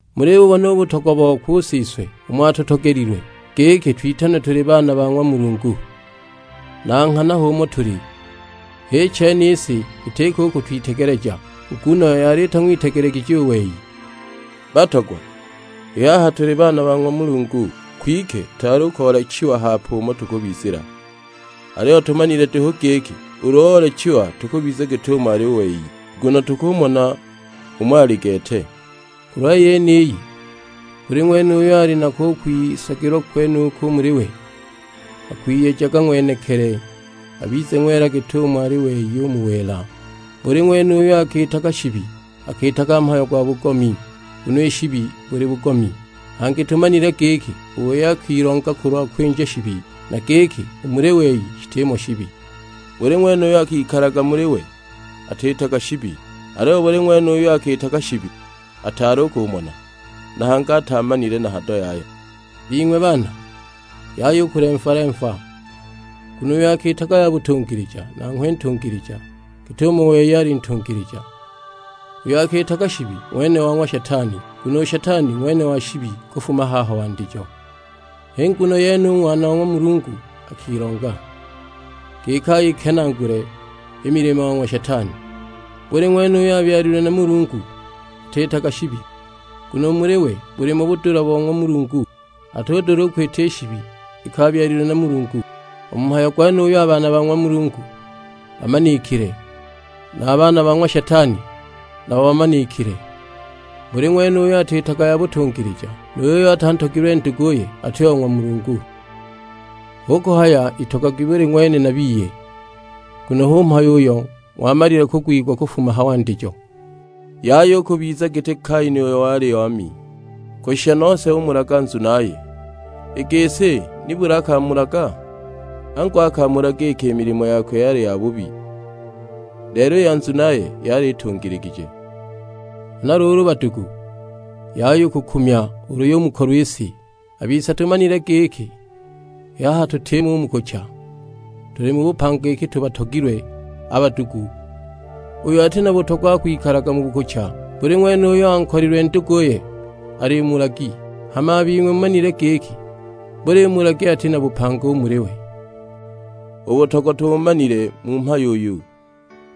Mulibubona u butogwa bokwe u Siswe umo atutogelilwe, giki twitanwe tuli baana ba ng'wa Mulungu, na nghana h'umo tuli! H'i chene i si itiko u kutwitegeleja, nguno yali itang'witegelegije u wei. Batogwa, i haha tuli baana ba ng'wa Mulungu, kwike gutaali u koolechiwa hape umo tukubizila; aliyo tumanile duhu giki ulu oolechiwa tukubiza git'umo ali u wei, nguno tukumona umo ali gete. Kulwa yeniyi, buli ng'wene uyo ali nako u kwisagilwa kwenuku muli we, akwiyeejaga ng'wenekili abize ng'wela git'umo ali u wei u mu wela. Buli ng'wene uyo akiitaga shibi akiitaga mhayo gwa bugomi, nguno i shibi buli bugomi. Hangi tumanile giki u wei akilonga kulwa kwinja shibi, na giki u muli wei shitimo shibi. Buli ng'wene uyo akikalaga muli we atiitaga shibi, aliyo buli ng'wene uyo akiitaga shibi ataali u kumona, na hangi ataamanile na hado yaya! Bing'we baana, yaya u kulemva-lemva, nguno uyo akiitaga ya butungilija nanghwe ntungilija git'umo wei ali ntungilija. Uyo akiitaga shibi ng'wene wa ng'wa Shetani, nguno u Shetani ng'wene wa shibi kufuma haho wandijo, h'i nguno yene u Ng'wana wa ng'wa Mulungu akilonga, giki ayikenaagule i milimo ya ng'wa Shetani. Buli ng'wene uyo abyalilwe na Mulungu atiitaga shibi, nguno u muli we bulimo budula bo ng'wa Mulungu, atudula u kwita i shibi iki abyalilwe na Mulungu. U mu mhayo gwenuyu a baana ba ng'wa Mulungu bamanikile, na a baana ba ng'wa Shetani nabo bamanikile. Buli ng'wene uyo atiitaga ya butungilija, nu yuyo atantogilwe nduguye, ati o ng'wa Mulungu! Hu kuhaya itogagwi buli ng'wene na biye, nguno hu mhayo uyo ng'wamalile kugwigwa kufuma ha wandijo. Yaya u kubiza giti Kaini uyo wali wa Mi, kushisha nose umulaga nzunaye. I gisi nibuli akamulaga? Angu akamulaga iki i milimo yakwe yali yabubi, lelo i ya nzunaye yali itungiligije. Huna luulu badugu, yaya u kukumya ulu yumukolwa i si. A bise tumanile giki i haha tutimo u mu kucha, tuli mu bupanga iki tubatogilwe a badugu; uyo ati na butogwa akwikalaga mu kucha! Buli ng'wene uyo ankolilwe nduguye ali mulagi, hama a bing'we mumanile giki buli mulagi ati na bupanga u muli we. U butogwa tubumanile mu mhayo uyu,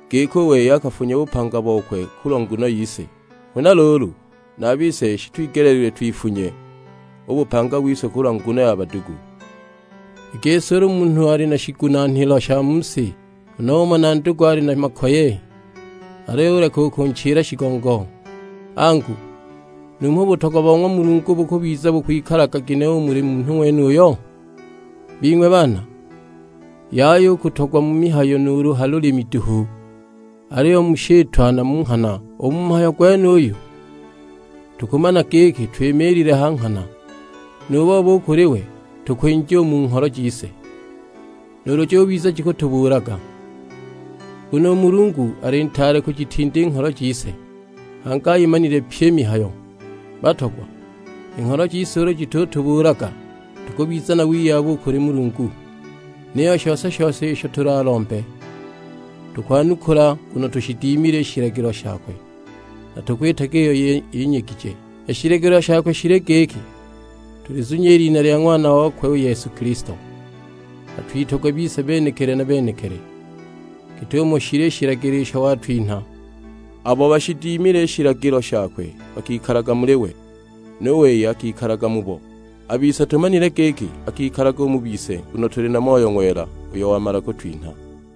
giki u wei akafunya bupanga bokwe kulwa nguno yise. Huna luulu na a bise shitwigeleelilwe twifunye u bupanga wise kulwa nguno ya badugu. I gisi ulu munhu ali na shiigunaanilo sha mu si, huna umona ndugu ali na makoye, aliyo uleka u kunchila shigongo, angu numho u butogwa bo ng'wa Mulungu bukubiza bukwikalaga ginehe u muli munhu ng'wenuyo? Bing'we baana, yaya u kutogwa mu mihayo nuulu ha lulimi duhu, aliyo mu shitwa na mu nghana. U mu mhayo gwenuyu tukumana giki twimiilile ha nghana; nu booba u kuli we tukwinja u mu ngholo jise, nuulu jubiza jikutubuulaga. Nguno u Mulungu ali ntaale kujitinda i ngholo jise, hangi ayimanile pyi i mihayo. Batogwa, i ngholo jise ulu jitutubuulaga tukubiza na wiyabi u kuli Mulungu. Niyo shose-shose isho tulalombe tukwanukula nguno tushidimile i shilagilo shakwe, na tukwitaga iyo yinyegije. I shilagilo shakwe shili giki, tulizunye i lina lya Ng'wana wakwe u Yesu Kilisto, na twitogwe bise benekili na benekili, git'umo shili i shilagilo isho watwinha. Abo bashidimile i shilagilo shakwe bakikalaga muli we, nu wei akikalaga mubo. A bise tumanile giki akikalaga u mu bise, nguno tuli na Moyo Ng'wela uyo wamala kutwinha.